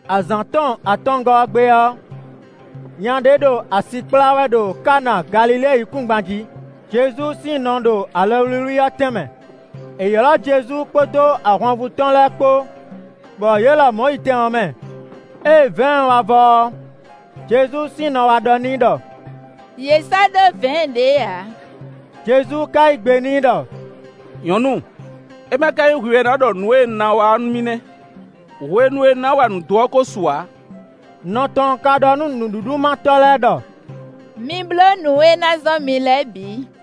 Azǎn tɔn atɔngɔ́ ɔ́ gbe ɔ́, nya ɖé ɖo asi kplá wɛ ɖo Kana Galilée yíkúngban jí. Jezu sín nɔ ɖo alɔwlíwlí ɔ́ tɛn mɛ. È ylɔ́ Jezu kpódó ahwanvú tɔn lɛ́ɛ kpó, bɔ yě lɔmɔ̌ yi tɛn ɔ́ mɛ. Ée vɛ̌ɛn wá vɔ ɔ́, Jezu sín nɔ wá ɖɔ n'i ɖɔ: “Yě sɔ́ ɖó vɛ̌ɛn ɖě ǎ.” Jezu ka yí gbe n'i ɖɔ: “Nyɔ̌nu, é ma ka nyí hwi wɛ ná ɖɔ nǔ e un ná wa ɔ́ nú mì nɛ́; hwenu e un ná wa nǔ dó ɔ́ ko su ǎ.” Nɔ tɔn ka ɖɔ nú nǔɖuɖumátɔ́ lɛ́ɛ ɖɔ: “Mi bló nǔ e é ná zɔ́n mi lɛ́ɛ bǐ.”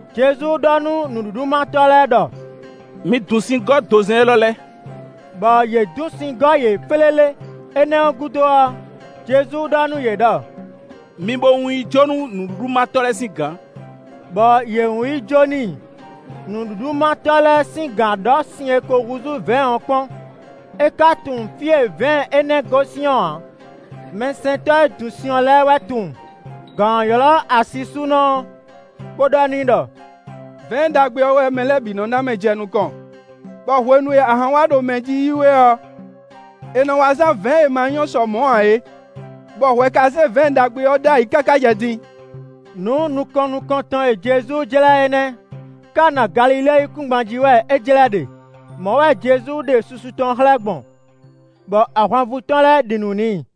Jezu ɖɔ nú nǔɖuɖumátɔ́ lɛ́ɛ ɖɔ: “Mi dun sin gɔ́ dozɛ́n élɔ́ lɛ́ɛ!” Bɔ yě dun sin gɔ́ yě flélé. Énɛ́ ɔ́ gúdo ɔ́, Jezu ɖɔ nú yě ɖɔ: “Mi bo wún yi jó nú nǔɖuɖumátɔ́ lɛ́ɛ sín gǎn,” bɔ yě wún yi jó n'i. Nǔɖuɖumátɔ́ lɛ́ɛ sín gǎn ɔ́ ɖɔ́ sin e ko húzú vɛ̌ɛn ɔ́ kpɔ́n; é ka tunwun fí e vɛ̌ɛn énɛ́ gosín ɔ́ ǎ; (mɛsɛntɔ́ e yi dun sin ɔ́ lɛ́ɛ wɛ tunwun.) Gǎn ɔ́ ylɔ́ asisúnɔ ɔ́, bó ɖɔ n'i ɖɔ: “Vɛ̌ɛn ɖagbe ɔ́ wɛ mɛ lɛ́ɛ bǐ nɔ ná mɛ jɛ nukɔn, bɔ hwenu e ahan wá ɖo mɛ jí yi wɛ ɔ́, è nɔ wá zán vɛ̌ɛn e ma nyɔ́ sɔ mɔ̌ ǎ é; bɔ hwɛ ka zé vɛ̌ɛn ɖagbe ɔ́ ɖ'ayǐ káká jɛ din.” Nǔ nukɔn nukɔntɔn e Jezu jlɛ́ é nɛ́; Kana Galilée yíkúngban jí wɛ é jlɛ́ ɖe. Mɔ̌ wɛ Jezu ɖe susu tɔn xlɛ́ gbɔn, bɔ ahwanvú tɔn lɛ́ɛ ɖi nǔ n'i.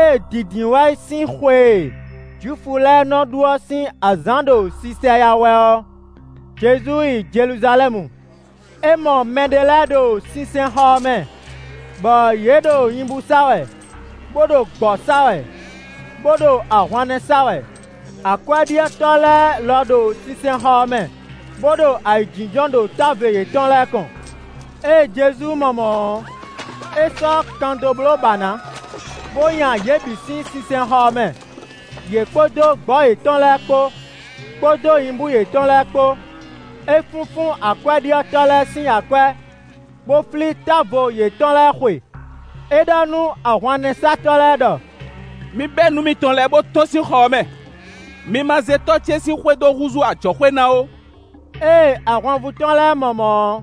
Ée Dǐndínwáyi sín xwe e Jwifu lɛ́ɛ nɔ ɖu ɔ́ sín azǎn ɖo sisɛyá wɛ ɔ́, Jezu yi Jeluzalɛ́mu. É mɔ mɛɖé lɛ́ɛ ɖo sinsɛnxɔ ɔ́ mɛ, bɔ yě ɖo nyibú sa wɛ, bó ɖo gbɔ̌ sa wɛ, bó ɖo ahwannɛ́ sa wɛ. Akwɛ́ɖyɔ́tɔ́ lɛ́ɛ lɔ ɖo sinsɛnxɔ ɔ́ mɛ, bó ɖo ayǐjínjɔ́n ɖo távo yětɔn lɛ́ɛ kɔn. Ée Jezu mɔ mɔ̌ ɔ́, é sɔ́ kan dó bló bǎ ná, bó nya yě bǐ sín sinsɛnxɔ ɔ́ mɛ, yě kpódó gbɔ̌ yětɔn lɛ́ɛ kpó, kpódó nyibú yětɔn lɛ́ɛ kpó. É fúnfún akwɛ́ɖyɔ́tɔ́ lɛ́ɛ sín akwɛ́, bó flí távo yětɔn lɛ́ɛ xwe. É ɖɔ nú ahwannɛ́satɔ́ lɛ́ɛ ɖɔ: “Mi bɛ́ nǔ mitɔn lɛ́ɛ, bó tɔ́n sín xɔ ɔ́ mɛ. Mi ma zé tɔ́ ce sín xwé dó húzú ajɔ̌xwé ná ó.” Ée ahwanvú tɔn lɛ́ɛ mɔ mɔ̌ ɔ́,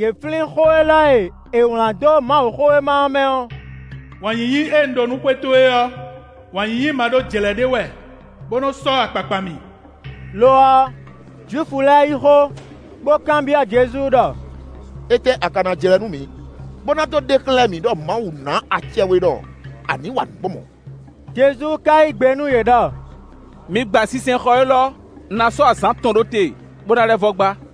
yě flín xó élɔ́ e è wlǎn dó Mawuxówéma ɔ́ mɛ ɔ́: “Wǎn yíyí e un ɖó nú xwé towe ɔ́, wǎn yíyí ma ɖó jlɛ̌ ɖé wɛ, bó nɔ́ sɔ́ akpakpa mì.” Lo ɔ́, Jwifu lɛ́ɛ yí xó, bó kanbyɔ́ Jezu ɖɔ: “Étɛ́ a ka ná jlɛ́ nú mǐ, bó ná dó ɖe xlɛ́ mǐ ɖɔ Mawu ná acɛ we ɖɔ a ní wa nǔ gbɔn mɔ̌?” Jezu ka yí gbe nú yě ɖɔ: “Mi gba sinsɛnxɔ élɔ́; un ná sɔ́ azǎn atɔn ɖó te bó ná lɛ́ vɔ́ gbá.”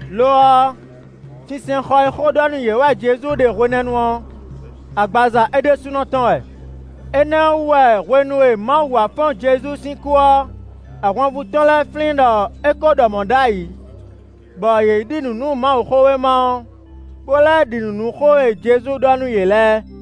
Lo ɔ́, sinsɛnxɔ e xó ɖɔ nú yě wɛ Jezu ɖe hwenɛ́nu ɔ́, agbaza é ɖésúnɔ tɔn wɛ. Énɛ́ ɔ́ wú wɛ hwenu e Mawu wá fɔ́n Jezu sín kú ɔ́, ahwanvú tɔn lɛ́ɛ flín ɖɔ é ko ɖɔ mɔ̌ ɖ'ayǐ; bɔ yě ɖi nǔ nú Mawuxówéma ɔ́, bó lɛ́ ɖi nǔ nú xó e Jezu ɖɔ nú yě lɛ́ɛ.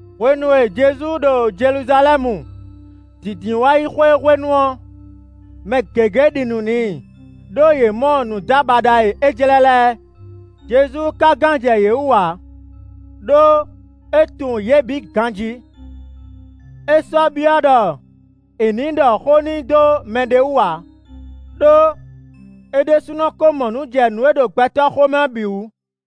Hwenu e Jezu ɖo Jeluzalɛ́mu, Dǐndínwáyixwe hwenu ɔ́, mɛ gěgé ɖi nǔ n'i, ɖó yě mɔ nǔdábaɖa e é jlɛ́ lɛ́ɛ. Jezu ka gán jɛ yě wú ǎ, ɖó é tunwun yě bǐ ganjí; é sɔ́ byɔ́ ɖɔ è nǐ ɖɔ xó n'i dó mɛɖé wú ǎ, ɖó é ɖésúnɔ ko mɔ nǔ jɛ nǔ e ɖo gbɛtɔ́ xomɛ ɔ́ bǐ wú.